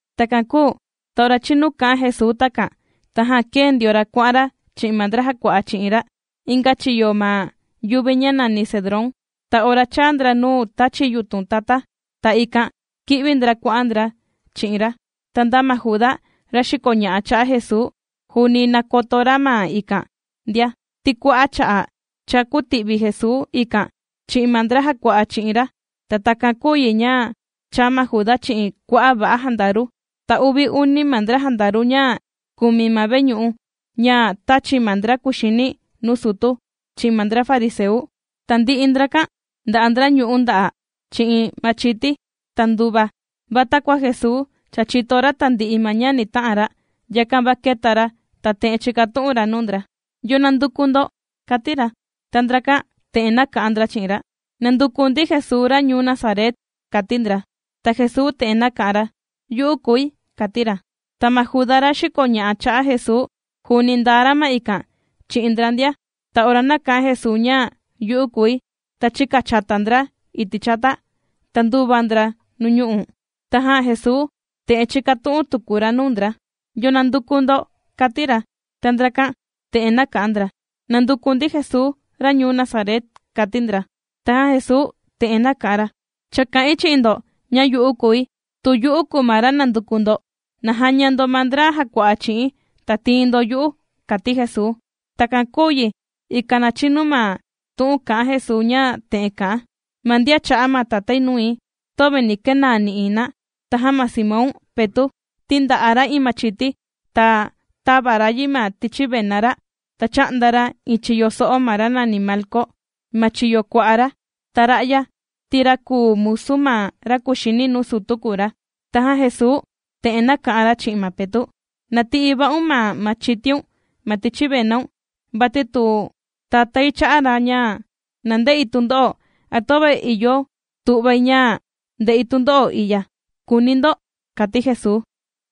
Takan kūu ta ora chinu kā'an Jesuu takan, tajan kēe ndio ra kuà'an ra chi'in ma ndra jàkua'a chi'in ra inga chiyo ma yuvi ña nàni Cedrón. Ta ora chāa ndra nuu tāchi yutun tata, ta ikan kī'vi ndra kuà'an ndra chi'in ra. Ta nda ma Juda, ra xìkoña'a cha'a' Jesuu, juuni nàkoto ra ma ikan ndia, ti kua'a' cha'a' cha kūti'vi Jesuu ikan chi'in ma ndra jàkua'a chi'in ra. Ta takan kūu yi ña chāa ma Juda chi'in kua'a' va'a jandaru, ta uvi uni ma ndra jandaru ña kùmi ma veñu'u, ña tāchi ma ndra kuxini nuu sutu, chi'in ma ndra fariseu. Tandi'i ndrakan nda'a ndra ñu'ú nda'a', chi'in machiti, ta nduva. Va takua Jesuu cha chìto ra tandi'i ma ña ni ta'an ra, yakan va kēta ra, ta te'en chīkatu'un ra nuu ndra: ―¿Yo nànduku ndo? ―kàti ra. Ta ndrakan te'en nāka'an ndra chi'in ra: ―Nànduku ndi Jesuu ra ñuu Nazaret ―kàti ndra. Ta Jesuu te'en naka'an ra: ―Yu'u kùi ―kàti ra. Ta ma Juda ra xìkoña'a cha'a' Jesuu juuni ndaa ra ma ikan chi'in ndra ndia. Ta ora nāka'an Jesuu ña; “Yu'u kùi”, ta chīkachata ndra iti' chata, ta ndūva ndra nuu ñu'u'. Tajan Jesuu te'en chīkatu'un tuku ra nuu ndra: ―¿Yo nànduku ndo? ―kàti ra. Ta ndrakan te'en nāka'an ndra: ―Nànduku ndi Jesuu ra ñuu Nazaret ―kàti ndra. Tajan Jesuu te'en nāka'an ra: ―Cha kā'in chi'in ndo, ña yu'u kùi. Tu yu'u kùu ma ra nànduku ndo, na jaña ndo ma ndra jàkua'a chi'i̱n, ta tìin ndo yu'u ―kàti Jesuu. Takan kūu yi, ikan na chinu ma tu'un kā'an Jesuu ña te'en kà'an: “Ma ndian chā'a ma Tatái nui, töve nī kenaa nï'iin na.” Tajan ma Simón Petu', ti ndà'a ra iin machiti, ta tāva ra yi ma tichi vena ra, ta chā'nda ra iin chiyo so'o ma ra nàni Malco, ma chiyo kua'a ra. Ta ra'ya ti ra kùu musu ma ra kuxini nuu sutu kùu ra. Tajan Jesuu te'en nāka'an ra chi'in ma Petu': ―Na ti'i va'un ma machitiun ma tichi venaun. Vati tu Tatái chā'a ra ña na nde'i tundo'o, ¿a töve ìyo tu'vai ña nde'i tundo'o i'ya?, kùuni ndo ―kàti Jesuu.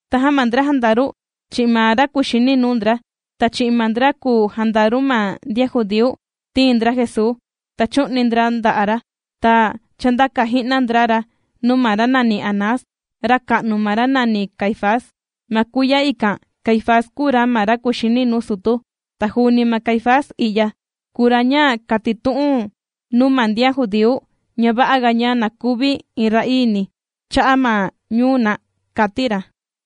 Tajan ma ndra jandaru, chi'in ma ra kuxini nuu ndra, ta chi'in ma ndra kùu jandaru ma ndian judíu, tīin ndra Jesuu, ta chū'ni ndra nda'a' ra. Ta chāndaka ji'na ndra ra nuu ma ra nàni Anás, raka'nu ma ra nàni Caifás. Ma kuiya ikan, Caifás kùu ra ma ra kuxini nuu sutu. Ta juuni ma Caifás i'ya, kùu ra ña kātitu'un nuu ma ndian judíu, ña va'aga ña na kuvi iin ra'iini cha'a' ma ñuu na, kāti ra.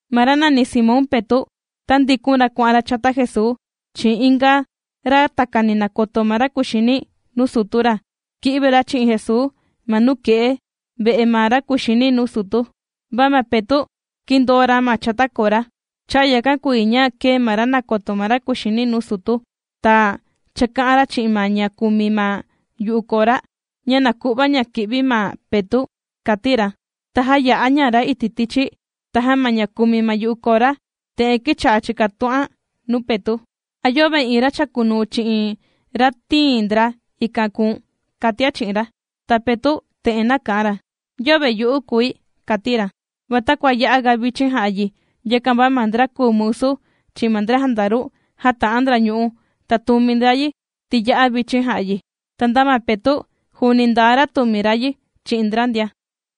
Ma ra nàni Simón Petu', tāndikun ra kuà'an ra chata Jesuu, chi'in inga, ra takani nàkoto ma ra kuxini nuu sutu ra, kī'vi ra chi'in Jesuu, ma nuke'e ve'e ma ra kuxini nuu sutu, va ma Petu', kīndoo ra ma chata kora. Cha'a' yakan kùu yi ña kēe ma ra nàkoto ma ra kuxini nuu sutu. Ta chāka'an ra chi'in ma ña kùmi ma yu'u kora, ña na ku'va ña kì'vi ma Petu', kàti ra. Ta jāya'a ña ra iti' tichi. Tajan ma ña kùmi ma yu'u kora, te'en kīcha'a chìkatu'an nuu Petu': ―¿A yöve iin ra chàkunuu chi'in ra tīin ndra ikan kùu̱n? ―kàtian chi'in ra. Ta Petu' te'en nāka'an ra: ―Yöve yu'u kùi ―kàti ra. Va takua ya'a ga vichin jà'a yi, yakan va ma ndra kùu musu, chi'in ma ndra jandaru, jāta'an ndra ñu'ú, ta tùmi ndra yi, ti ya'a vichin jà'a yi. Ta nda ma Petu', juuni ndaa ra tùmi ra yi chi'in ndra ndia.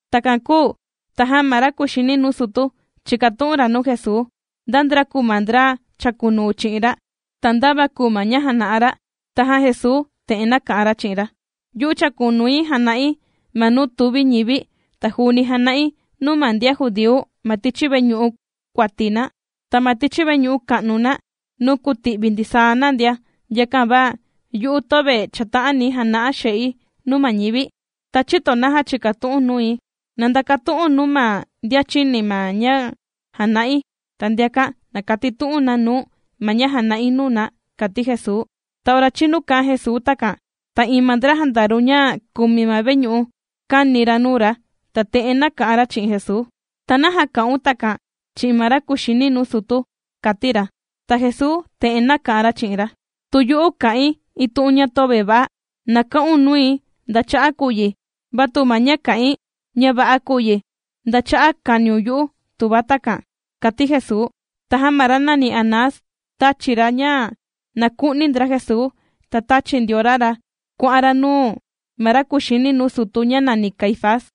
Takan kūu tajan ma ra kuxini nuu sutu, chīkatu'un ra nuu Jesuu, nda ndra kùu ma ndra chàkunuu chi'in ra, ta nda va kùu ma ña jàna'a ra. Tajan Jesuu te'en nāka'an ra chi'in ra: ―Yu'u chàkunui jàna'i ma nuu tuvi ñivi, ta juuni jàna'i nuu ma ndian judíu ma tichi veñu'u kuati na, ta ma tichi veñu'u ka'nu na nuu kùti'vi ndisaa na ndia. Yakan va, yu'u töve chàta'ani̱ jana'a xe'i nuu ma ñivi. ¿Ta chïto naja chìkatu'u̱n nui? Na ndakatu'u̱n nuu ma ndian chīni ma ña jāna'i, ta ndiakan na katitu'un na nuu̱n ma ña jāna'i nuu na ―kàti Jesuu. Ta ora chīnu kā'an Jesuu takan, ta iin ma ndra jandaru ña kùmi ma veñu'u, kāni ra nuu ra, ta te'en nāka'an ra chi'in Jesuu: ―¿Ta naja kà'un takan chi'in ma ra kuxini nuu sutu? ―kàti ra. Ta Jesuu te'en nāka'an ra chi'in ra: ―Tu yu'u kā'in iin tu'un ña töve va'a, na ka'un nui nda cha'a' kùu yi. Va tu ma ña kā'in, ña va'a kùu yi, ¿nda cha'a' kāniun yu'u tuva takan? ―kàti Jesuu. Tajan ma ra nàni Anás tāchi ra, ña na ku'ni ndra Jesuu, ta tāchi ndio ra ra kuà'an ra nuu ma ra kuxini nuu sutu ña nàni Caifás.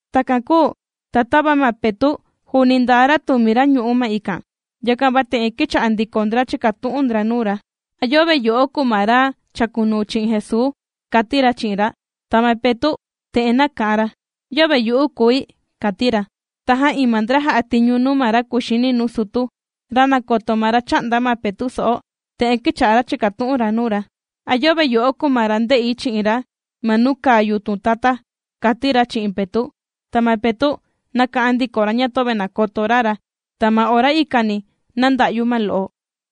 Takan kūu ta tava ma Petu' juuni ndaa ra tùmi ra ñu'ú ma ikan, yakan va te'en kīcha'a ndiko ndra chìkatu'un ndra nuu ra: ―¿A yöve yo'o, kùu ma ra chàkunuu chi'in Jesuu? ―kàti ra chi'in ra. Ta ma Petu' te'en nāka'an ra: ―Yöve yu'u kùi ―kàti ra. Tajan iin ma ndra jà'a tiñu nuu ma ra kuxini nuu sutu, ra nàkoto ma ra chā'nda ma Petu' so'o, te'en kīcha'a ra chìkatu'un ra nuu ra: ―¿A yöve yo'o kùu ma ra ndē'i chi'in ra ma nuu kàa yutun tata? ―kàti ra chi'in Petu'. Ta ma Petu' nāka'an ndiko ra ña töve nàkoto ra ra, ta ma ora ikani nānda'yu ma lo'o.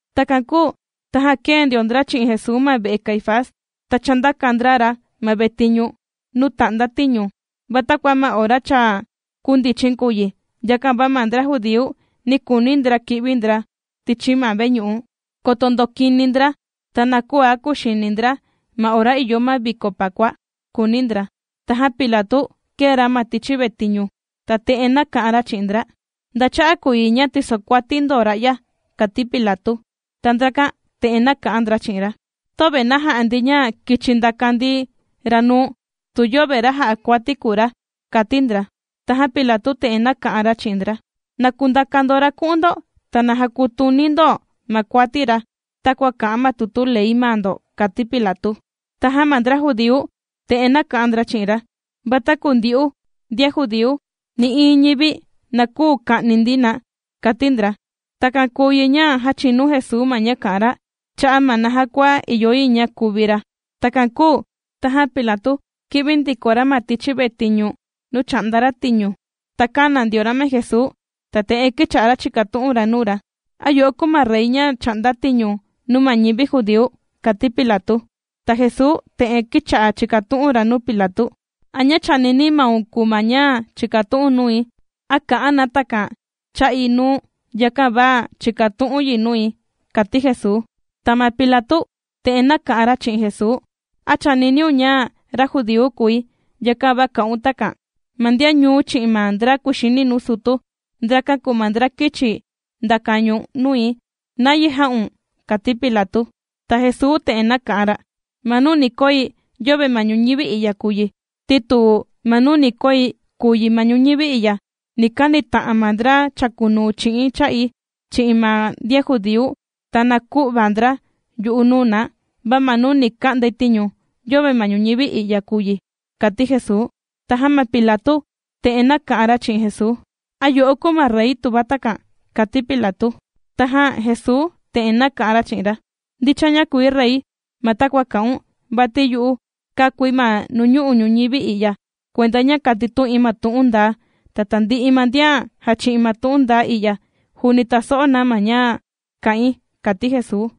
Takan kūu tajan kēe ndio ndra chi'in Jesuu ma ve'e Caifás, ta chāndaka ndra ra ma vetiñu nuu tà'nda tiñu. Va takua ma ora cha kūndichin kùu yi, yakan va ma ndra judíu, nī kuuni ndra kì'vi ndra tichi ma vetiñu, koto ndokini ndra, ta na küa kuxini ndra ma ora ìyo ma viko Pakua, kùuni ndra. Tajan Pilatu kēe ra ma tichi vetiñu, ta te'en nāka'an ra chi'in ndra: ―¿Nda cha'a' kùu yi ña tìsokuati ndo ra'ya? ―kàti Pilatu. Ta ndrakan te'en nāka'an ndra chi'in ra: ―Töve na ja'a ndi ña kichi ndaka ndi ra nuu̱n, tu yöve ra jà'a kuati kùu ra ―kàti ndra. Tajan Pilatu te'en nāka'an ra chi'in ndra: ―Na kundaka ndo ra ku'un ndo, ta na jakutuni ndo ma kuati ra, takua kà'an ma tutu ley maa ndo ―kàti Pilatu. Tajan ma ndra judíu te'en nāka'an ndra chi'in ra: ―Va taku ndyu'u ndian judíu, nï'iin ñivi na küu ka'ni ndi na ―kàti ndra. Takan kūu yi ña jāchinu Jesuu ma ña kā'an ra, cha'a' ma naja kua ìyo yi ña kuvi ra. Takan kūu tajan Pilatu kī'vi ndiko ra ma tichi vetiñu nuu chà'nda ra tiñu, ta kāna ndio ra ma Jesuu, ta te'en kīcha'a ra chìkatu'un ra nuu ra: ―¿A yo'o kùu ma rey ra chà'nda tiñu nuu ma ñivi judíu? ―kàti Pilatu. Ta Jesuu te'en kīcha'a chìkatu'un ra nuu Pilatu: ―¿A ña chànini maun kùu ma ña chìkatu'u̱n nui, a kà'an na takan cha'i nuu̱n, yakan va chìkatu'u̱n yi nui? ―kàti Jesuu. Ta ma Pilatu te'en nāka'an ra chi'in Jesuu: ―¿A chàniniun ña ra judíu kùi, yakan va kà'un takan? Ma ndian ñuu̱n, chi'in ma ndra kuxini nuu sutu, ndrakan kùu ma ndra kīchi ndaka ñu̱n nui. ¿Nayi jā'un? ―kàti Pilatu. Ta Jesuu te'en nāka'an ra: ―Ma nuu ni koi, yöve ma ñuñivi i'ya kùu yi. Ti tu ma nuu ni koi kùu yi ma ñuñivi i'ya, ni kanita'an ma ndra chàkunuu chi'i̱n cha'i, chi'in ma ndian judíu, ta na kü'va ndra yu'u nuu na. Va ma nuu ni ka'ndai tiñu yöve ma ñuñivi i'ya kùu yi ―kàti Jesuu. Tajan ma Pilatu te'en nāka'an ra chi'in Jesuu: ―¿A yo'o kùu ma rey tuva takan? ―kàti Pilatu. Tajan Jesuu te'en nāka'an ra chi'in ra: ―Ndicha ña kùi rey, ma takua kà'un. Vati yu'u kākui ma nuu ñu'u' ñuñivi i'ya kuenda ña katitu'in ma tu'un ndaa. Ta tandi'i ma ndian jàchi'in ma tu'un ndaa i'ya, juuni tàso'o na ma ña kà'in ―kàti Jesuu.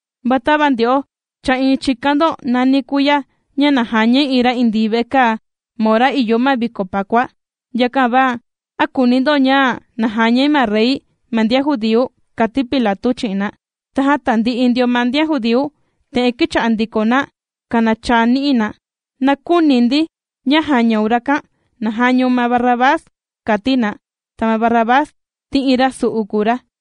Va tava ndyo'o, cha iin chìkan ndo nàni kuiya ña na jañai iin ra indii vekaa, ma ora ìyo ma viko Pakua. Yakan va, ¿a kùuni ndo ña na jañai ma rey ma ndian judíu? ―kàti Pilatu chi'in na. Tajan tandi'i ndio ma ndian judíu, te'en kīcha'a ndiko na kanachaa ni'i na: ―¡Na küuni ndi ña jañaun rakan! ¡Na jañaun ma Barrabás! ―kàti na. Ta ma Barrabás, ti iin ra su'u kùu ra.